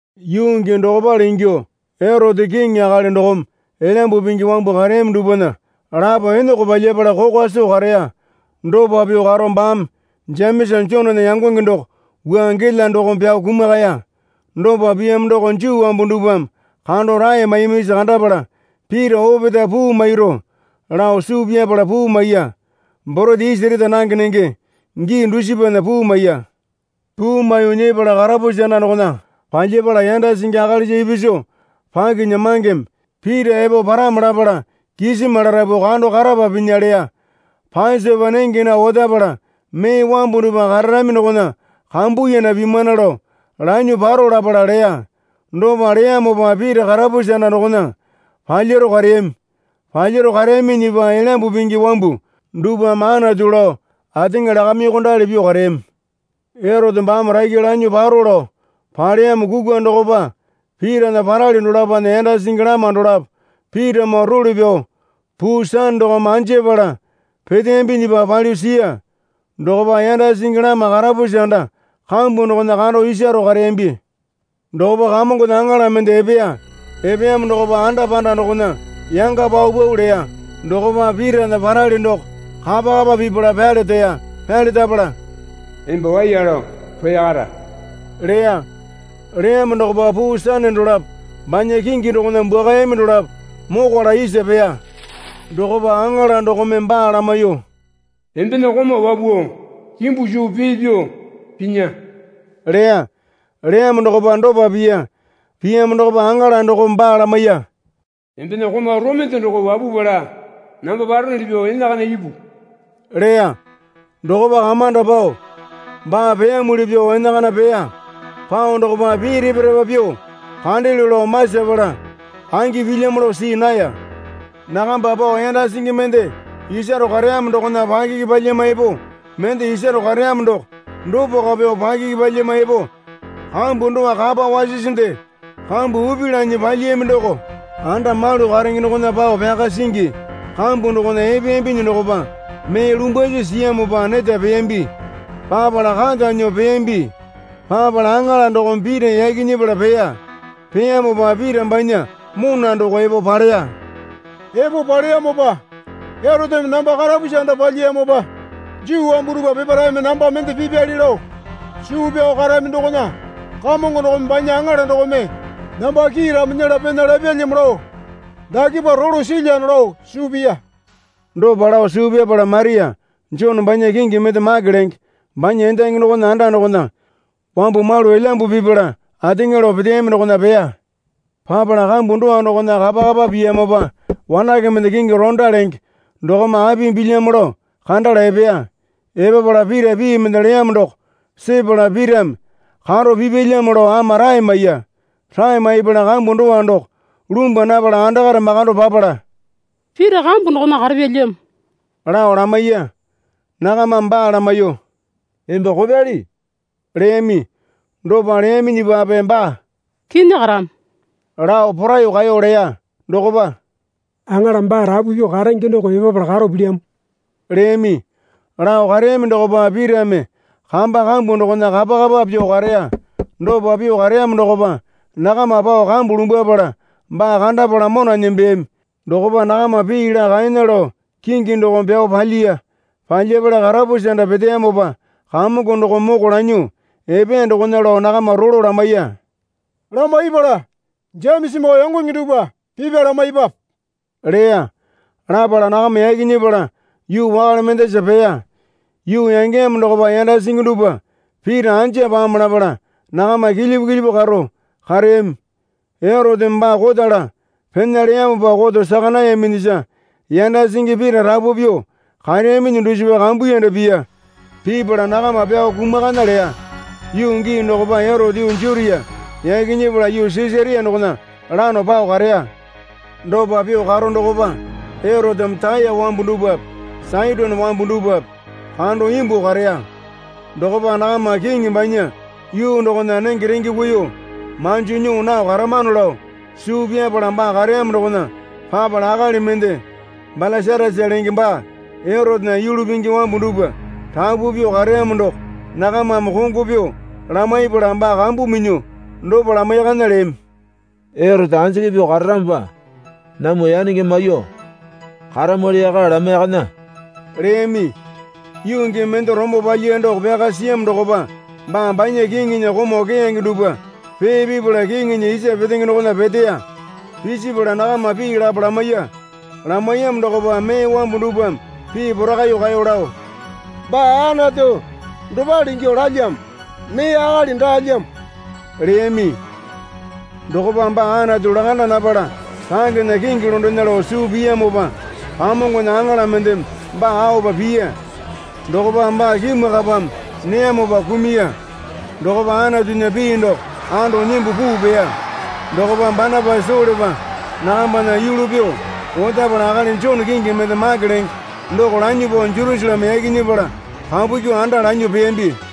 Yuu gii dokopale ingyuo Erote kiŋi akali dokome Elyambu Pingi wambu kareyami dupwana lapo eneko palyapala kokwa soo kareya. Dopa pyuo karo baame Jemesa Jonena yangonge doko wua gela dokome pyao kumakaya. Dopa piyamo doko Juu wambu dupwame kando rae maiyamisa kandapala Pita opetae puu mairu lao suu pyapala puu maiya. (Borete isi reta nange nenge gii dusipana puu maiya.) Puu maiyuo nyepala karapusi anda dokona palyapala yanda singi akalisa ipisu pakinyamangeme Pita epo paramo lapala kisima larapu kando karapa pinya leya. Pasopa nenge nao otapala mee wambu dupwa kararami dokona kambuyanda pimana lao lanyuo paro lapala leya. Dopa leyamopa Pita karapusi anda dokona palyaro kareyami. Palyaro kareyaminyipa Elyambu Pingi wambu dupwame Anatu lao ateŋa lakamyuokondali pyuo kareyami. Erote baame rakya lanyuo paro lao paleyamo kukwa dokpa Pitana parali dolapona yanda singi lama dolapo Pitamoo role pyao puu sane dokome anjapala peteyambinyipa palyuo siya. Dokopa yanda singi lama karapusi anda kambu dokona kando isaro kareyambi. Dokopa Kamongona aŋala mende epeya. Epeyamo dokopa anda panda dokona yanga paupau leya. Dokopa Pitana parali doko kapa kapa pipala pyalereya. Pyalerapala, Emba waiya lao roya kara leya. Leyamo dokopa puu sane dolapo banya kingi dokona bwuakayami dolapo mokwala isa peya. Dokopa aŋala dokome baa lamaiyuo, Embena komau wapuo kimbu suu pee pyuo pinya leya. Leyamo dokopa dopa piya. Piyamo dokopa aŋala dokome baa lamaiya. Embena komau romende doko wapupala namba paronuli pyuo enakana ipu leya. Dokopa kamanda pao baa peyamuli pyuo enakana peya. Pao dokopa pii repa repa pyuo kandelyo lao masapala angi pilyamo lao see naya. Nakamba pao yanda singi mende isaro kareyamo dokona pakiki palyama epo mende isaro kareyamo doko dopako pyuo pakiki palyama epo kambu dowa kapa wasisinde kambu upi lanyi palyiyami doko anda malu karenge dokona pao pyaka singi kambu dokona epeyambinyi dokopa mee lumbwasi siyamopa neta peyambi. Papala kata nyuo peyambi. Papala aŋala dokome Pita yaki nyepala peya. Peyamopa Pita banya mona doko epo paleya. Epo paleyamopa, Eroteme namba karapusi anda palyiyamopa Juu wambu dupwa peparaeme namba mende pipyali lao suu pyao karami dokona Kamongo dokome banya aŋala dokome namba kiiramo nyela pena lapyalyamo lao dakepa rolo silyano lao suu piya. Dopa lao suu pyapala Maria, Jone banya kingi mende Make lenge banya endangi dokona anda dokona wambu malu elyambu pipala ateŋa lao peteyami dokona peya. Papala kambu dowa dokona kapa kapa piyamopa wanake mende kingi Orota lenge dokome apimi pilyamo lao kandala epeya. Epapala Pita pii mende leyamo doko sepala Pitame karo pipyalyamo lao ama rae maiya. Rae maipala kambu dowa doko lumbwa napala andakare makando papala, Pita kambu dokona karapyalyamo, lao lamaiya. Nakamame baa lamaiyuo, Emba kopyali, leyami. Dopa leyaminyipape baa, Kinyi karamo, lao poraiyuo kaeyo leya. Dokopa, Aŋala baa rapu pyuo karenge doko epapala karo pilyamo, leyami. Lao kareyami dokopa Pitame kamba kambu dokona kapa kapa pyuo kareya. Dopa pyuo kareyamo dokopa nakama pao kambu lumbwapala baa kandapala mona nembeyami. Dokopa nakama pii laa kaena lao kingi dokome pyao palyiya. Palyapala karapusi anda peteyamopa Kamongo dokome moko lanyuo epeya dokona lao nakama rolo lamaiya. Lamaipala, Jemesamoo yangonge dupwa pipya lamaipwape, leya. Lapala nakama yaki nyepala yuu wakale mendasa peya. Yuu yangeyamo dokopa yanda singi dupwa Pita anja pamo lapala nakama kilyipu kilyipu karo kareyami. Eroteme baa kotala pena leyamopa koto saka nayaminyisa yanda singi Pita rapu pyuo kareyaminyi dusipa kambuyanda piya. Pipala nakama pyao kumakana leya. Yuu gii dokopa Erote yuu Jutia yaki nyepala yuu Sisaria dokona lano pao kareya. Dopa pyuo karo dokopa Eroteme Taya wambu dupwape Saitone wambu dupwape kando imbuo kareya. Dokopa nakama kiŋi banya yuu dokona nenge renge kuiyuo manjo nyuo nao karamano lao suu pyapala baa kareyamo dokona papala akali mende Balasatasa lenge baa Erotena yulu pingi wambu dupwa rapu pyuo kareyamo doko nakamame kongo pyuo lamaipala baa kambu minyuo dopa lamaiyakana leyami. Erote anjiki pyuo kararamopa namwa yanenge maiyuo karamwali yaka lamaiyakana, leyami. Yuu gii mende rombo palyiya doko pyaka siyamo dokopa baa banya kiŋinya komau keyange dupwa pee pipala kiŋinya isa petenge dokona peteya. Pisipala nakama pii lapo lamaiya. Lamaiyamo dokopa mee wambu dupwame pii porakaiyuo kaeyo lao, Baa Anatu dopale ingyuo lalyamo. Mee akali daalyamo, leyami. Dokopa baa Anatu lakanda napala rangena kingi londena lao suu piyamopa Kamongona aŋala mendeme baa aopa piya. Dokopa baa kimwakapame neyamopa kumuya. Dokopa Anatunya pii doko ando nyimbu puu peya. Dokopa Banapasa Solepa nakambana yulu pyuo otapala akali Jone kingi mende Make lenge doko lanyuo pao Jerusaleme yaki nyepala kapu kyuo anda lanyuo peyambi.